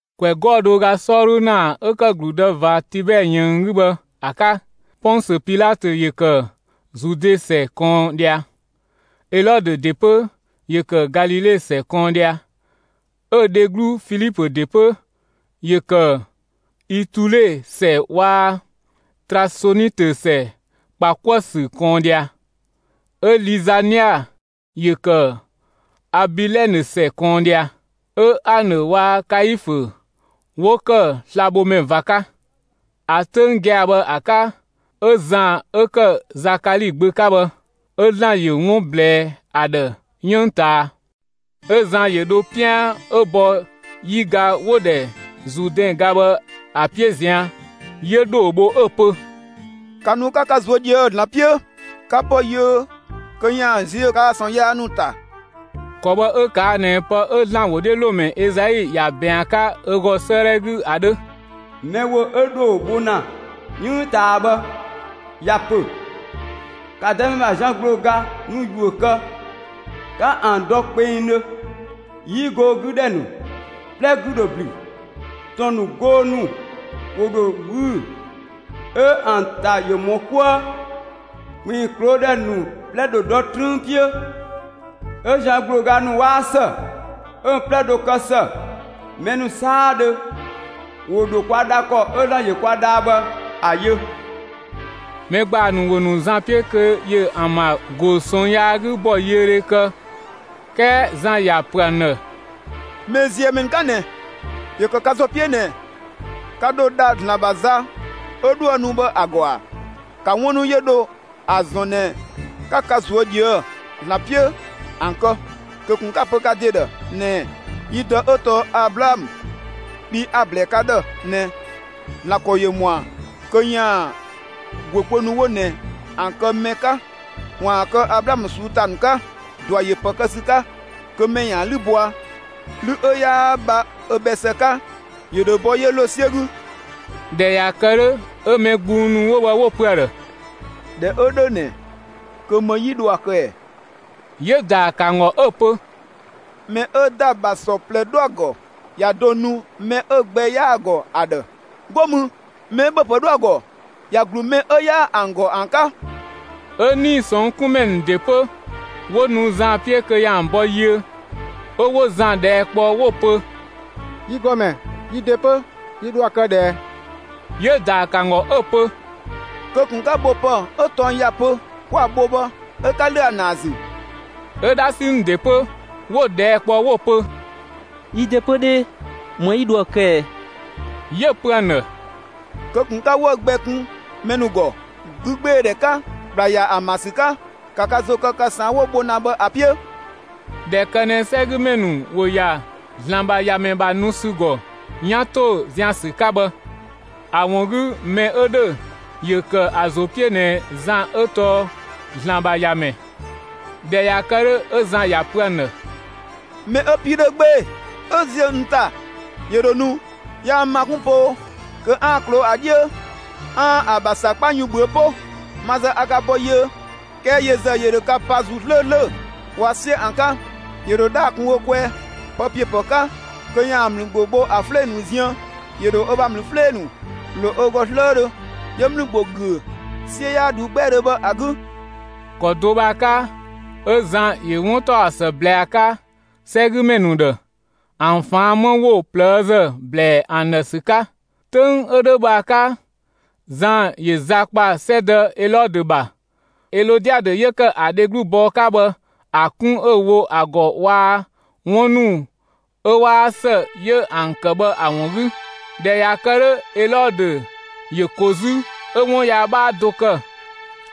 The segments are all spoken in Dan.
‑Kwɛ 'gɔɔ‑ do ö ga 'sɔɔdhu ‑naa 'ö ‑kë ‑gludë ꞊va Tibɛɛ ꞊yënng 'gü bhë ‑a 'ka, Pɔnsö Pilatö ‑yö ‑kë Zude ‑sɛ ꞊kɔɔn ꞊dhia; Elɔdö ‑de 'pö ‑yö ‑kë Galile ‑sɛ ꞊kɔɔn ꞊dhia, 'ö‑ dheglu Filipö ‑de 'pö, ‑yö ‑kë Itule ‑sɛ waa‑ Trasonitö ‑sɛ ‑kpa 'kuë‑ ‑sü ꞊kɔɔn ꞊dhia; 'ö Lizania ‑yö ‑kë Abilɛnë ‑sɛ ꞊kɔɔn ꞊dhia, 'Ö Anë waa‑ Kaifö 'wo ‑kë slabhomɛ ꞊va 'ka. ‑A 'töng gia‑ bhë ‑a 'ka 'ö Zan 'ö ‑kë Zakali gbö 'ka bhë, 'ö ‑Zlan ‑yö 'wun ꞊blɛɛ ‑a ‑dhë 'yënng ꞊taa. 'Ö Zan ‑yö dho 'pian 'ö bɔ 'yiga 'wo‑ ‑dhɛ Zuudɛn ga bhë ‑a 'piö ꞊zian', 'yö ‑dhoo bho 'ö‑ pö: «‑Ka nu 'ka ka ꞊zuö' ꞊dhië'‑ ‑Zlan 'piö, 'ka bɔ yiö kö ‑yaan ziö kaa‑ ꞊sɔɔn yaa ‑nu ‑ta!» ‑Kɔ bhë 'ö ꞊kaa' ꞊nɛ pë 'ö ‑Zlan ‑wodhiölomɛ Ezai ‑ya ꞊bɛɛn ‑a 'ka ö ‑gɔ 'sëëdhɛ 'gü ‑a 'dhö: Mɛ ‑wo 'ö ‑dhoo bho ‑na 'yënng ꞊taa bhë ‑ya ‑pö: ‑Ka Dëmɛ ‑bha zian ‑gblooga ‑nu ‑yuö kë, 'ka ‑an dɔ kpengdhö! 'Yi goo 'gü ‑dhɛ ‑nu 'plɛ 'gü ‑dho ‑blü; ‑tɔn ‑nu, goo ‑nu ‑wo ‑dho ꞊wüü'‑, 'ö ‑an ‑ta ‑yö ‑mɔ 'kuë. ‑Kpinng ꞊kloo' ‑dhɛ ‑nu 'plɛ ‑dho dɔ 'trüün 'piö, 'ö zian ‑gblooga ‑nu 'waa ‑së, 'ö‑ 'plɛ ‑dho kë ‑së. Mɛ ‑nu 'saadhö ‑wo ‑dho kwa dha ‑kɔ 'ö ‑Zlan ‑yö kwa dhaa bhë ‑a yö. Mɛ ‑gbaa ‑nu ‑wo ‑nu Zan 'piö kö ‑yö ‑an ‑bha ‑go ꞊sɔɔn yaa 'gü ‑bɔyiödhe kë, 'kɛɛ Zan ‑ya ‑pö ‑an ‑dhë: «꞊Mɛɛziëmɛ ‑nu 'ka ꞊nɛ! ‑Yö ‑kë ka ‑zo 'piö ꞊nɛ ka ‑dho dha ‑Zlan ‑bha za 'ö 'dhoë‑ nu bhë ‑a ‑gɔ ‑a? ‑Ka 'wun ‑nu 'yö dho ‑a ‑zɔn ꞊nɛ 'ka ka ꞊zuö' ꞊dhië ‑Zlan 'piö ‑an kë; kö ꞊kun 'ka‑ pö ka ‑de ‑dhë ꞊nɛɛ: ‹Yi dë 'ö tɔɔ Ablaamö,› bhii a‑ ‑blɛɛ ka ‑dhë ꞊nɛ ‑Zlan ‑kɔ ‑yö ‑mɔa kö ‑yaan ‑guö kpö ‑nu 'wo ꞊nɛ ‑an kë mɛ 'ka ‑waan kë Ablaamö ꞊suu'‑ ‑ta ‑nu 'ka! ꞊Dua ‑yö ‑pë kë ‑sü 'ka kö mɛ ‑yaan 'lü bɔa. 'Lü 'ö 'yaa bha ö bhɛ ‑së 'ka, ‑yö ‑dho bɔ 'yö ‑lo 'siö 'gü.» ꞊Dhɛ ꞊ya kë 'dhö, 'ö mɛ gbung ‑nu 'wo bhë 'wo‑ pö ‑a ‑dhë: «꞊Dhɛ 'ö 'dhö ꞊nɛ, kö ‑më 'yi dho ‑a kë ꞊ɛ?» 'Yö‑ ‑daa ‑kë ‑an ‑gɔ 'ö‑ pö: «Mɛ 'ö ‑da ‑bha ‑sɔ ꞊plɛ 'dho ‑a ‑gɔ, ‑ya do nu mɛ 'ö‑ gbɛ 'yaa‑ ‑gɔ ‑a ‑dhë. 'Go mü, mɛ 'ö ‑bhöpë 'dho ‑a ‑gɔ, ‑ya ‑glu mɛ 'ö 'yaa ‑an ‑gɔ ‑an 'ka!» 'Ö 'nii‑ ꞊sɔnng' 'kun ‑mɛ ‑nu ‑de 'pö, 'wo nu Zan 'piö kö ‑yaan ‑an bɔ yiö, 'ö 'wo Zan ꞊dhɛɛ' kpɔ 'wo‑ pö: «Yi ‑Gɔmɛ, yi ‑de 'pö, yi ‑dho ‑a kë ꞊dhë ꞊ɛ?» 'Yö‑ ‑daa ‑kë ‑an ‑gɔ 'ö‑ pö: «Kö ꞊kun 'ka bho ‑pë 'ö tɔng ‑ya pö 'kwa‑ bho bhë 'ö 'ka ‑lö ‑a ‑naa ‑zü!» 'Ö 'dhasi ‑nu ‑de 'pö, 'wo‑ ꞊dhɛɛ' kpɔ 'wo‑ pö: «Yi ‑de 'pö 'dhee, ‑më 'yi dho ‑a kë ꞊ɛ?» 'Yö‑ pö ‑an ‑dhë: «Kö ꞊kun 'ka 'wëü‑ gbɛ kun mɛ ‑nu ‑gɔ 'gügbeedhɛ 'ka, ‑kpla ‑ya ‑an ‑bha ‑sü 'ka; ‑ka ka ‑zo kë ka ꞊saan' 'wo‑ bho ‑na bhë ‑a 'piö!» ꞊Dhɛ ‑kë ꞊nɛ 'sɛgümɛ ‑nu ‑wo ‑ya ‑Zlan ‑bha ‑Yamɛ ‑bha nu ‑sü ‑gɔ 'yan ‑to zian‑ ‑sü 'ka bhë, ‑a ‑wun 'gü mɛ 'ö ‑dhö 'yö ‑kë ‑a ‑zo 'piö ꞊nɛ Zan 'ö tɔɔ ‑Zlan ‑bha ‑Yamɛ. ꞊Dhɛ ꞊ya kë 'dhö, 'ö Zan ‑ya ‑pö ‑an ‑dhë: «Mɛ 'ö‑ 'pii 'dhö 'gbee‑ 'ö ꞊zië' n ‑ta, ‑yö ‑dho nu; yaa n ‑ma 'kun poo kö 'aan‑ ꞊kloo'‑ ‑a 'dhiö 'aan‑ ‑a ‑bha ‑sakpa yun ꞊bhüö' 'po. Ma ‑zë a ka ‑bɔ yiö, 'kɛɛ yö ‑zë ‑yö ‑dho ka pa ‑Zuu 'slööslö waa‑ 'siö ‑an 'ka. ‑Yö ‑dho 'dhaa‑ kun ö kwɛɛ, pë ‑piö ‑pë 'ka kö ‑yaan ‑mlü ‑gbo bho ‑a 'flee‑ ‑nu ziën. ‑Yö ‑dho ö bha ‑mlü 'flee‑ ‑nu ‑lo ö ‑gɔ 'slëëdhö, 'yö ‑mlü ‑gbo ‑güö 'siö 'yaa ꞊dhuu 'gbɛɛdhö bhë ‑a 'gü.» ‑Kɔ do bhë ‑a 'ka, 'ö Zan ‑yö 'wuntaɔsë ꞊blɛɛ ‑a 'ka 'sɛgümɛ ‑nu ‑dhë, ‑an ꞊faan' 'më ‑wo ꞊plëëzë ꞊blɛɛ'‑ ‑an ‑dhë ‑sü 'ka. 'Töng 'ö 'dhö bhë ‑a 'ka, Zan ‑yö za ‑kpa 'sɛdë Elɔdö ‑bha, Elɔdiadö 'yö ‑kë ‑a dheglu bɔɔ 'ka bhë ‑a 'kun 'ö‑ wo ‑a ‑gɔ waa‑ 'wun ‑nu 'ö 'waa ‑së 'yö ‑an ‑kë bhë ‑a ‑wun 'gü. ꞊Dhɛ ꞊ya kë 'dhö, Elɔdö ‑yö ko 'zü, 'ö 'wun yaa 'bhaa do kë,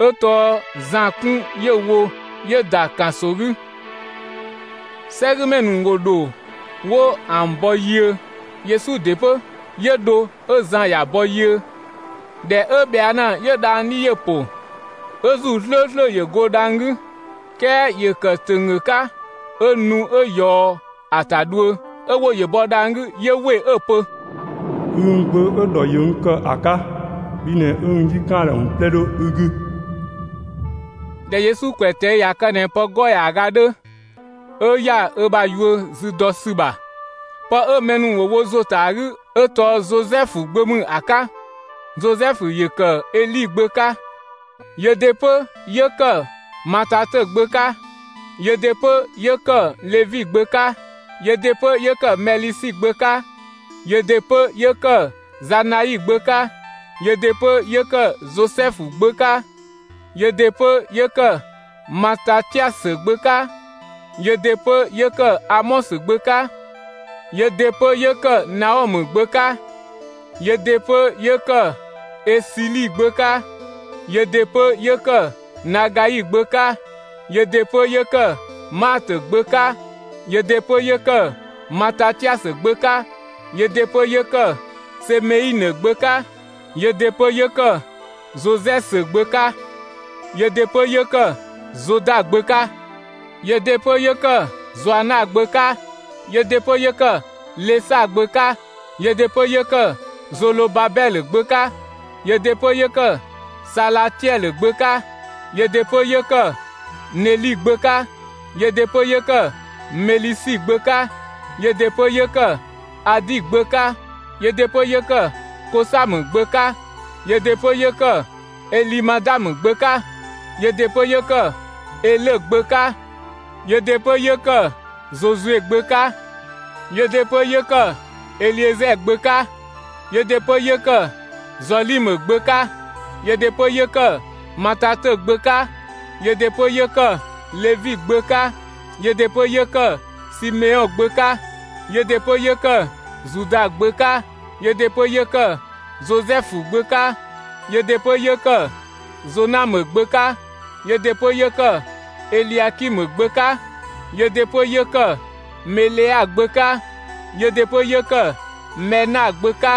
'ö tɔɔ Zan 'kun 'yö‑ wo 'yö‑ ‑da ‑kanso 'gü. 'Sɛgümɛ ‑nu ‑wo ‑dho 'wo ‑an bɔ yiö. Yesu ‑de 'pö, 'yö dho, 'ö Zan ‑ya bɔ yiö. ꞊Dhɛ 'ö ꞊bhɛa' ‑na, 'yö dhang‑ 'dhi ‑yö ‑po, 'Ö ‑Zuu 'slööslö ‑yö go dhang‑ 'gü; 'kɛɛ ‑yö ‑kë ‑tönggö 'ka 'ö nu 'ö ꞊yɔɔ ‑a ‑ta dhuö; 'ö ‑wo ‑yö bɔ dhang‑ 'gü 'yö ‑we 'ö‑ pö: «Ü n Gbö 'ö‑ ‑dhɔ ‑yö n ‑kë ‑a 'ka, bhi ꞊nɛ 'ö n 'yi ‑kan ‑a ‑dhë ‑wun 'plɛ 'dho ü 'gü.» ꞊Dhɛ Yesu ‑kwɛ ꞊tɛi' ꞊ya kë ꞊nɛ pë 'gɔɔ‑ ‑yaaga 'dhö, 'ö ‑ya ö bha yuö zü dɔ ‑sü ‑bha. Pë 'ö mɛ ‑nu ‑wo wo ‑zo ‑ta ‑a 'gü 'ö tɔɔ Zozɛfu gbö ‑mü ‑a 'ka. Zozɛfu ‑yö ‑kë Eli gbö 'ka, yö ‑de 'pö 'yö ‑kë Matatö gbö 'ka, yö ‑de 'pö 'yö ‑kë Levi gbö 'ka, yö ‑de 'pö 'yö ‑kë Mɛlisi gbö 'ka, yö ‑de 'pö 'yö ‑kë Zanai gbö 'ka, yö ‑de 'pö 'yö ‑kë Zozɛfu gbö 'ka, yö ‑de 'pö 'yö ‑kë Matatiasö gbö 'ka, yö ‑de 'pö 'yö ‑kë Amɔsö gbö 'ka, yö ‑de 'pö 'yö ‑kë Naɔmë gbö 'ka, yö ‑de 'pö 'yö ‑kë Esili gbö 'ka, yö ‑de 'pö 'yö ‑kë Nagai gbö 'ka, yö ‑de 'pö 'yö ‑kë Maatö gbö 'ka, yö ‑de 'pö 'yö ‑kë Matatiasö gbö 'ka, yö ‑de 'pö 'yö ‑kë Semeinë gbö 'ka, yö ‑de 'pö 'yö ‑kë Zozɛsö gbö 'ka, yö ‑de 'pö 'yö ‑kë Zoda gbö 'ka, yö ‑de 'pö 'yö ‑kë Zoana gbö 'ka, yö ‑de 'pö 'yö ‑kë Lesa gbö 'ka, yö ‑de 'pö 'yö ‑kë Zolobabɛlö gbö 'ka, yö ‑de 'pö 'yö ‑kë Salatiɛlö gbö 'ka, yö ‑de 'pö 'yö ‑kë Neli gbö 'ka, yö ‑de 'pö 'yö ‑kë Melisi gbö 'ka, yö ‑de 'pö 'yö ‑kë Adi gbö 'ka, yö ‑de 'pö 'yö ‑kë Kosamë gbö 'ka, yö ‑de 'pö 'yö ‑kë Elimadamë gbö 'ka, yö ‑de 'pö 'yö ‑kë Elö gbö 'ka, yö ‑de 'pö 'yö ‑kë Yesu gbö 'ka, yö ‑de 'pö 'yö ‑kë Eliezɛɛ gbö 'ka, yö ‑de 'pö 'yö ‑kë Zɔlimë gbö 'ka, yö ‑de 'pö 'yö ‑kë Matatö gbö 'ka, yö ‑de 'pö 'yö ‑kë Levi gbö 'ka, yö ‑de 'pö 'yö ‑kë Simeɔn gbö 'ka, yö ‑de 'pö 'yö ‑kë Zuda gbö 'ka, yö ‑de 'pö 'yö ‑kë Zozɛfu gbö 'ka, yö ‑de 'pö 'yö ‑kë Zonamë gbö 'ka, yö ‑de 'pö 'yö ‑kë Eliakimë gbö 'ka, yö ‑de 'pö 'yö ‑kë Melea gbö 'ka, yö ‑de 'pö 'yö ‑kë Mɛna gbö 'ka,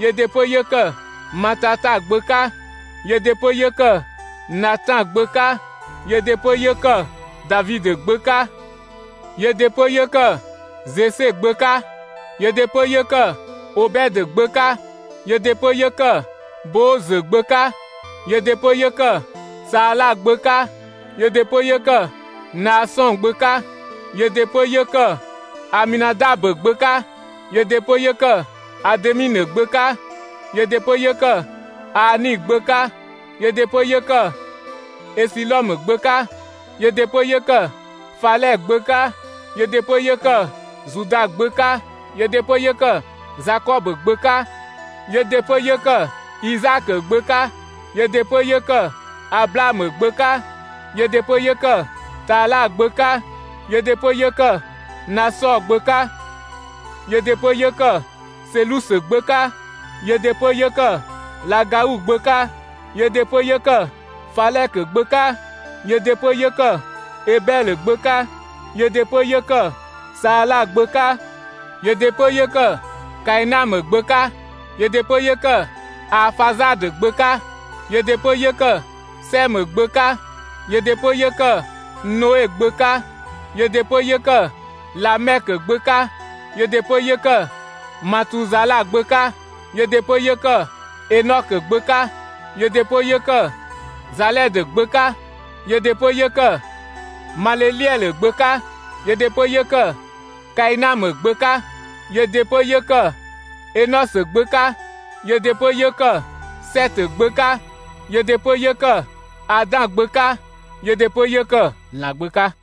yö ‑de 'pö 'yö ‑kë Matata gbö 'ka, yö ‑de 'pö 'yö ‑kë Natan gbö 'ka, yö ‑de 'pö 'yö ‑kë Davidö gbö 'ka, yö ‑de 'pö 'yö ‑kë Zese gbö 'ka, yö ‑de 'pö 'yö ‑kë Obɛdö gbö 'ka, yö ‑de 'pö 'yö ‑kë Boozö gbö 'ka, yö ‑de 'pö 'yö ‑kë Saala gbö 'ka, yö ‑de 'pö 'yö ‑kë Naasɔn gbö 'ka, yö ‑de 'pö 'yö ‑kë Aminadabö gbö 'ka, yö ‑de 'pö 'yö ‑kë Ademinë gbö 'ka, yö ‑de 'pö 'yö ‑kë Aani gbö 'ka, yö ‑de 'pö 'yö ‑kë Esilɔmë gbö 'ka, yö ‑de 'pö 'yö ‑kë Falɛ gbö 'ka, yö ‑de 'pö 'yö ‑kë Zuda gbö 'ka, yö ‑de 'pö 'yö ‑kë Zakɔbö gbö 'ka, yö ‑de 'pö 'yö ‑kë Izaakö gbö 'ka, yö ‑de 'pö 'yö ‑kë Ablaamö gbö 'ka, yö ‑de 'pö 'yö ‑kë Tala gbö 'ka, yö ‑de 'pö 'yö ‑kë Nasɔɔ gbö 'ka, yö ‑de 'pö 'yö ‑kë Selusö gbö 'ka, yö ‑de 'pö 'yö ‑kë Lagau gbö 'ka, yö ‑de 'pö 'yö ‑kë Falɛkö gbö 'ka, yö ‑de 'pö 'yö ‑kë Ebɛlö gbö 'ka, yö ‑de 'pö 'yö ‑kë Saala gbö 'ka, yö ‑de 'pö 'yö ‑kë Kainamë gbö 'ka, yö ‑de 'pö 'yö ‑kë Aafazadö gbö 'ka, yö ‑de 'pö 'yö ‑kë Sɛmë gbö 'ka, yö ‑de 'pö 'yö ‑kë Noe gbö 'ka, yö ‑de 'pö 'yö ‑kë Lamɛkö gbö 'ka, yö ‑de 'pö 'yö ‑kë Matuzala gbö 'ka, yö ‑de 'pö 'yö ‑kë Enɔkö gbö 'ka, yö ‑de 'pö 'yö ‑kë Zalɛdö gbö 'ka, yö ‑de 'pö 'yö ‑kë Maleleɛlö gbö 'ka, yö ‑de 'pö 'yö ‑kë Kainamë gbö 'ka, yö ‑de 'pö 'yö ‑kë Enɔsö gbö 'ka, yö ‑de 'pö 'yö ‑kë Sɛtö gbö 'ka, yö ‑de 'pö 'yö ‑kë Adan gbö 'ka, yö ‑de 'pö 'yö ‑kë ‑Zlan gbö 'ka.